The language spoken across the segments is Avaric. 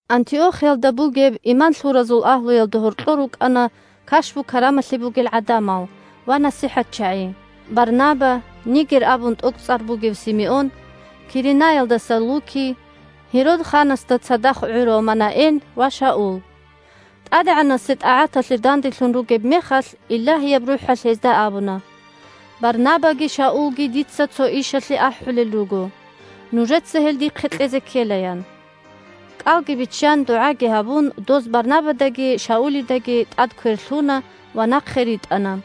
Антиохиялда бугеб иман лъуразул агьлуялда гьоркьор рукӀана кашпу-карамалъи бугел гӀадамал ва насихӀатчагӀи: Барнаба, Нигер абун тӀокӀцӀар бугев Симеон, Киренаялдаса Лукий, Гьерод ханасда цадахъ гӀурав Манаэн ва Шаул. ТӀадегӀанасе тӀагӀаталъе данделъун ругеб мехалъ, Илагьияб РухӀалъ гьезда абуна: «Барнабаги Шаулги дица цо ишалъе ахӀулел руго. Нужеца гьел дихъе кьезе ккела», – ян. КӀалги биччан, дугӀаги гьабун, доз Барнабадаги Шаулидаги тӀад квер лъуна ва нахъе ритӀана.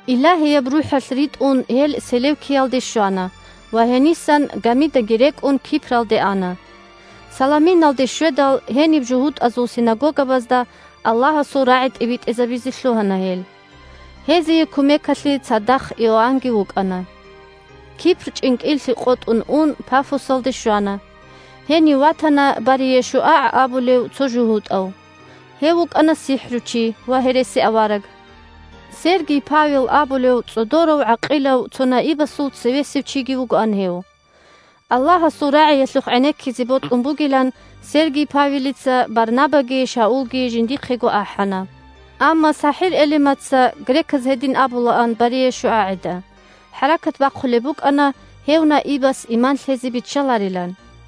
Илагьияб РухӀалъ ритӀун гьел Селевкиялде щвана ва гьенисан, гамидаги рекӀун, Кипралде ана. Саламиналде щведал, гьениб жугьутӀазул синагогабазда Аллагьасул рагӀи тӀибитӀизабизе лъугьана гьел. Гьезие кумекалъе цадахъ Иоаннги вукӀана. Кипр чӀинкӀиллъи къотӀун ун Пафосалде щвана. Гьенив ватана БариешуагӀ абулев цо жугьутӀав. Гьев вукӀана сихӀручи ва гьересиавараг. Сергий Павел абулев цӀодорав-гӀакъилав цо наибасул цевесев чиги вугоан гьев. Аллагьасул рагӀиялъухъ гӀенеккизе бокьун бугилан Сергий Павелица Барнабаги Шаулги жиндихъего ахӀана. Амма СахӀир-Элимаца (греказ гьедин абулаан БариешуагӀида) хӀаракат бахъулеб букӀана гьев наибас иман лъезе биччаларилан.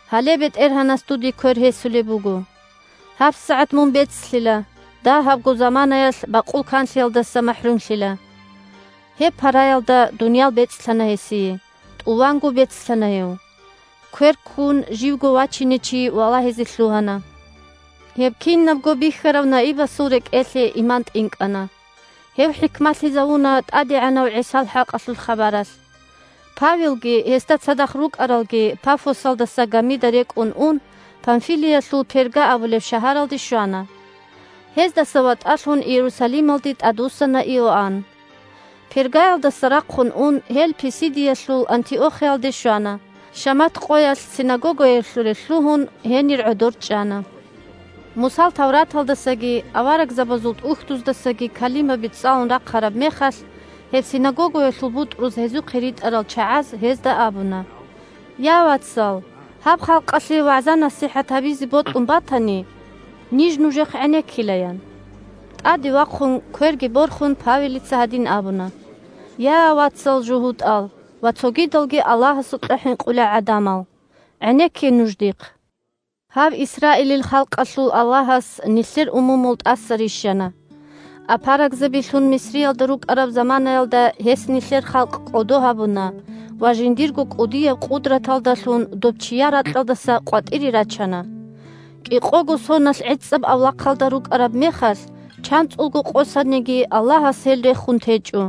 Гьале БетӀергьанас дуде квер гьесулеб буго. ГьабсагӀат мун бецлъила, дагьабго заманаялъ бакъул канлъиялдаса махӀрумлъила! Гьеб параялда дуниял бецӀлъана гьесие, тӀуванго бецлъана гьев. Квер ккун живго вачине чи валагьизе лъугьана. Гьеб кинабго бихьарав наибасул рекӀелъе иман тӀинкӀана. Гьев хӀикмалъизавуна ТӀадегӀанав ГӀисал хӀакъалъулъ хабаралъ. Павелги гьесда цадахъ рукӀаралги Пафосалдаса гамида рекӀун ун, Памфилиялъул Перга абулеб шагьаралде щвана. Гьездаса ватӀалъун Иерусалималде тӀадвуссана Иоанн. Пергаялдаса рахъун ун гьел Писидиялъул Антиохиялде щвана, шамат къоялъ синагогаялъуре лъугьун, гьенир гӀодор чӀана. Мусал Тавраталдасаги Аварагзабазул ТӀухьдуздасаги калимаби цӀалун рахъараб мехалъ, гьеб синагогаялъул бутӀруз гьезухъе ритӀарал чагӀаз гьезда абуна: – Я, вацал, гьаб халкъалъе вагӀза-насихӀат гьабизе бокьун батани, ниж нужехъ гӀенеккила, – ян. ТӀаде вахъун, кверги борхун, Павелица гьадин абуна: – Я, вацал жугьутӀал ва цогидалги Аллагьасукьа хӀинкъулел гӀадамал, гӀенекке нуж дихъ! Гьаб Исраилил халкъалъул Аллагьас нилъер умумул тӀаса рищана, апарагзабилъун Мисриялда рукӀараб заманаялда Гьес нилъер халкъ кӀодо гьабуна ва жиндирго кӀудияб къудраталдалъун доб чияр ракьалдаса къватӀире рачана. КӀикъого соналъ гӀицӀаб авлахъалда рукӀараб мехалъ, чанцӀулго къосаниги, Аллагьас гьел рехун течӀо.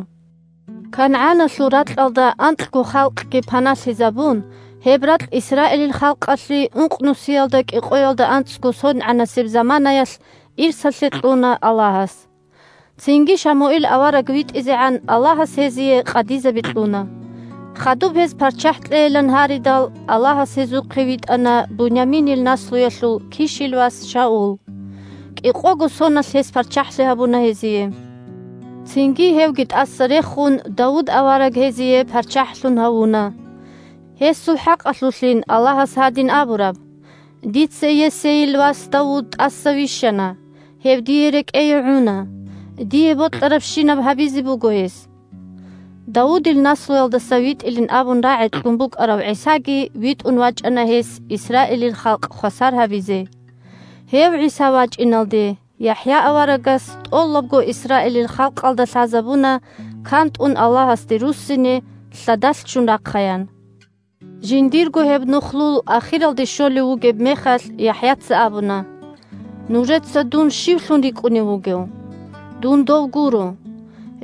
КангӀаналъул ракьалда анкьго халкъги паналъизабун, гьеб ракь Исраилил халкъалъе ункънусиялда кӀикъоялда анцӀго сонгӀанасеб заманаялъ ирсалъе кьуна Аллагьас. Цинги Шамуил авараг витӀизегӀан Аллагьас гьезие къадизаби кьуна. Хадуб гьез парччахӀ кьейилан гьаридал, Аллагьас гьезухъе витӀана Буняминил наслуялъул Кишил вас Шаул. КӀикъого соналъ гьес парччахӀлъи гьабуна гьезие. Цинги, гьевги тӀаса рехун, Давуд авараг гьезие парччахӀлъун гьавуна. Гьесул хӀакъалъулъин Аллагьас гьадин абураб: «Дица Йессейил вас Давуд тӀаса вищана. Гьев Дие рекӀее гӀуна. Дие бокьарабщинаб гьабизе буго гьес». Давудил наслуялдаса витӀилин абун рагӀи кьун букӀарав ГӀисаги витӀун вачӀана Гьес Исраилил халкъ хвасар гьабизе. Гьев ГӀиса вачӀиналде ЯхӀя аварагас тӀолабго Исраилил халкъалда лъазабуна кантӀун Аллагьасде руссине лъадалъ ччун рахъаян. Жиндирго гьеб нухлул ахиралде щолев вугеб мехалъ, ЯхӀяца абуна: «Нужеца дун щивлъун рикӀкӀунев вугев? Дун Дов гуро.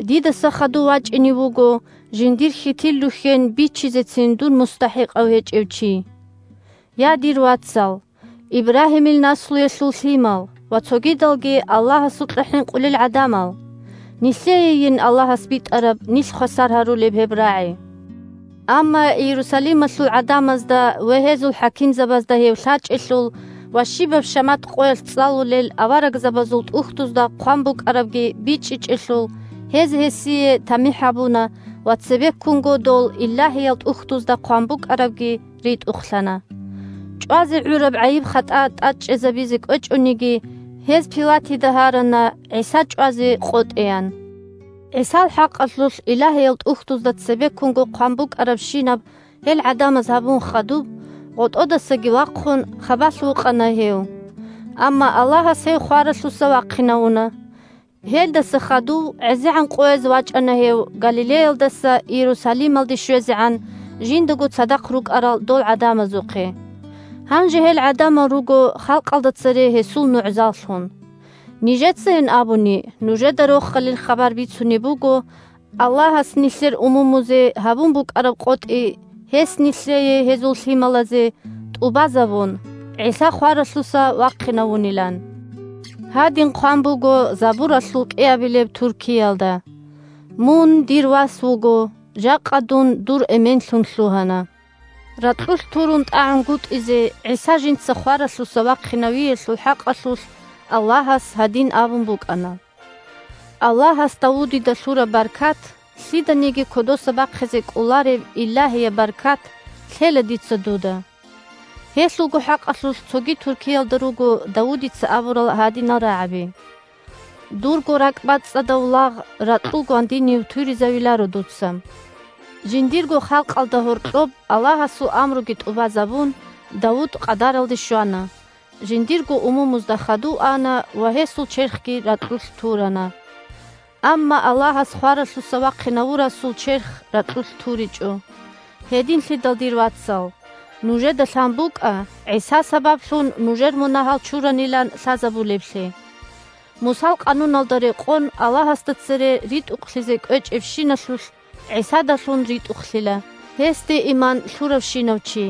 Дидаса хадув вачӀине вуго жиндир хьитил рухьен бичизецин дун мустахӀикъав гьечӀев чи». Я, дир вацал – Ибрагьимил наслуялъул лъимал ва цогидалги Аллагьасукьа хӀинкъулел гӀадамал! Нилъеейин Аллагьас битӀараб нилъ хвасар гьарулеб гьеб рагӀи. Амма Иерусалималъул гӀадамазда ва гьезул хӀакимзабазда гьев лъачӀелъул ва щибаб шамат къоялъ цӀалулел Аварагзабазул ТӀухьдузда хъван букӀарабги бичӀчӀичӀелъул, гьез гьесие тамихӀ гьабуна ва цебеккунго дол Илагьиял ТӀухьдузда хъван букӀарабги ритӀухълъана. ЧӀвазе гӀураб гӀайиб-хатӀа тӀадчӀезабизе кӀвечӀониги, гьез Пилатида гьарана ГӀиса чӀвазе къотӀеян. ГӀисал хӀакъалъулъ Илагьиял ТӀухьдузда цебеккунго хъван букӀарабщинаб гьел гӀадамаз гьабун хадуб, гъотӀодасаги вахъун, хабалъ вукъана гьев. Амма Аллагьас гьев хваралъуса вахъинавуна. Гьелдаса хадув гӀезегӀан къояз вачӀана гьев Галилеялдаса Иерусалималде щвезегӀан жиндаго цадахъ рукӀарал дол гӀадамазухъе. Гьанже гьел гӀадамал руго халкъалда цере гьесул нугӀзаллъун. Нижецайин абуни нужеда Рохалил хабар бицунеб буго, Аллагьас нилъер умумузе гьабун букӀараб къотӀи гьес нилъее – гьезул лъималазе – тӀубазабун, ГӀиса хваралъуса вахъинавунилан. Гьадин хъван буго Забуралъул кӀиабилеб туркиялда: «Мун Дир вас вуго. Жакъа Дун дур Эменлъун лъугьана». Ракьулъ турун тӀагӀунгутӀизе ГӀиса жинца хваралъуса вахъинавиялъул хӀакъалъулъ Аллагьас гьадин абун букӀана: «Аллагьас Давудида лъураб баркат – лъиданиги кодоса бахъизе кӀолареб Илагьияб баркат – лъела Дица дуда». Гьелъулго хӀакъалъулъ цоги туркиялда руго Давудица абурал гьадинал рагӀаби: «Дурго ракӀбацӀцӀадав лагъ ракьул гвандинив туризавиларо Дуца». Жиндирго халкъалда гьоркьоб Аллагьасул амруги тӀубазабун, Давуд къадаралде щвана, жиндирго умумузда хадув ана ва гьесул черхги ракьулъ турана. Амма Аллагьас хваралъуса вахъинавурасул черх ракьулъ туричӀо. Гьединлъидал, дир вацал, нужеда лъан букӀа ГӀиса сабаблъун нужер мунагьал чуранилан лъазабулеблъи. Мусал къануналда рекъон Аллагьасда цере ритӀухълъизе кӀвечӀебщиналъулъ ГӀисадалъун ритӀухълъила гьесде иман лъуравщинав чи.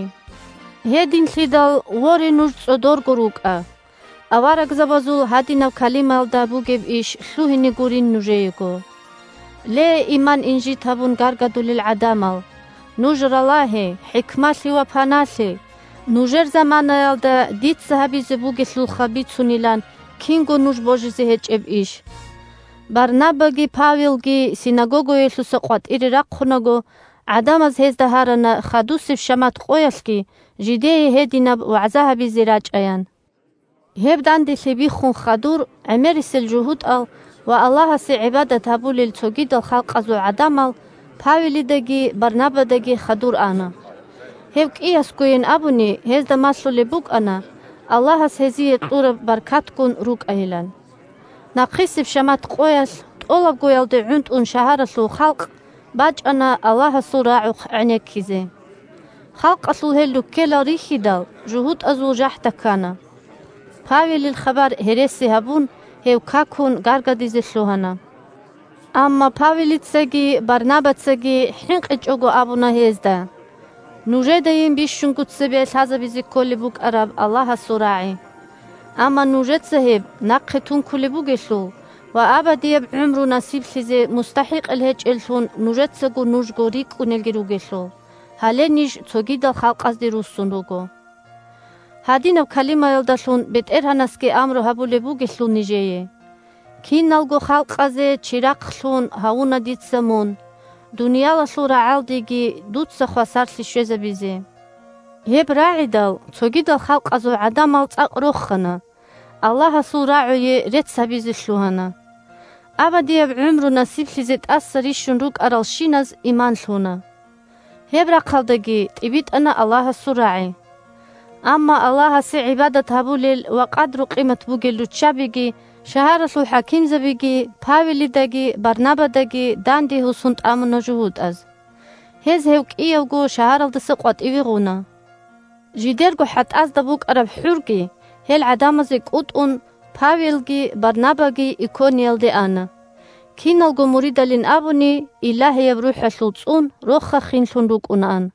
Гьединлъидал, воре, нуж цӀодорго рукӀа, аварагзабазул гьадинаб калимаялда бугеб иш лъугьине гурин нужеего: «Ле, иман инжит гьабун гаргадулел гӀадамал, нуж ралагье, хӀикмалъе ва паналъе, нужер заманаялда Дица гьабизе бугелъулха бицунилан кинго нуж божизе гьечӀеб иш». Барнабаги Павелги синагогаялъуса къватӀире рахъунаго, гӀадамаз гьезда гьарана хадусеб шамат къоялъги жидее гьединаб вагӀза гьабизе рачӀаян. Гьеб данделъи биххун хадур гӀемерисел жугьутӀал ва Аллагьасе гӀибадат гьабулел цогидал халкъазул гӀадамал Павелидаги Барнабадаги хадур ана. Гьев кӀиясгойин абуни гьезда малъулеб букӀана Аллагьас гьезие кьураб баркатгун рукӀайилан. Нахъисеб шамат къоялъ тӀолабгоялде гӀунтӀун шагьаралъул халкъ бачӀана Аллагьасул рагӀухъ гӀенеккизе. Халкъалъул гьел руккелал рихьидал, жугьутӀазул жахӀда ккана: Павелил хабар гьереси гьабун, гьев какун гаргадизе лъугьана. Амма Павелицаги Барнабацаги хӀинкъичӀого абуна гьезда: – Нужедайин бищунго цебе лъазабизе кколеб букӀараб Аллагьасул рагӀи. Амма нужеца гьеб нахъе тункулеб бугелъул ва абадияб гӀумру насиблъизе мустахӀикъал гьечӀеллъун нужецаго нужго рикӀкӀунелги ругелъул, гьале ниж цогидал халкъазде руссун руго! Гьадинаб калимаялдалъун БетӀергьанасги амру гьабулеб бугелъул нижее: «Киналго халкъазе чирахълъун гьавуна Дица Мун, дуниялалъул рагӀалдеги дуца хвасарлъи щвезабизе». Гьеб рагӀидал, цогидал халкъазул гӀадамал цӀакъ рохана, Аллагьасул рагӀуе рецц гьабизе лъугьана. Абадияб гӀумру насиблъизе тӀаса рищун рукӀаралщиназ иман лъуна. Гьеб рахъалдаги тӀибитӀана Аллагьасул рагӀи. Амма Аллагьасе гӀибадат гьабулел ва къадру-къимат бугел руччабиги шагьаралъул хӀакимзабиги Павелидаги Барнабадаги данде гьусун тӀамуна жугьутӀаз. Гьез гьев кӀиявго шагьаралдаса къватӀиве гъуна. Жидерго хӀатӀазда букӀараб хӀурги гьел гӀадамазде кӀутӀун, Павелги Барнабаги Икониялде ана. Киналго муридалин абуни, Илагьияб РухӀалъул цӀун, роха-хинлъун рукӀунаан.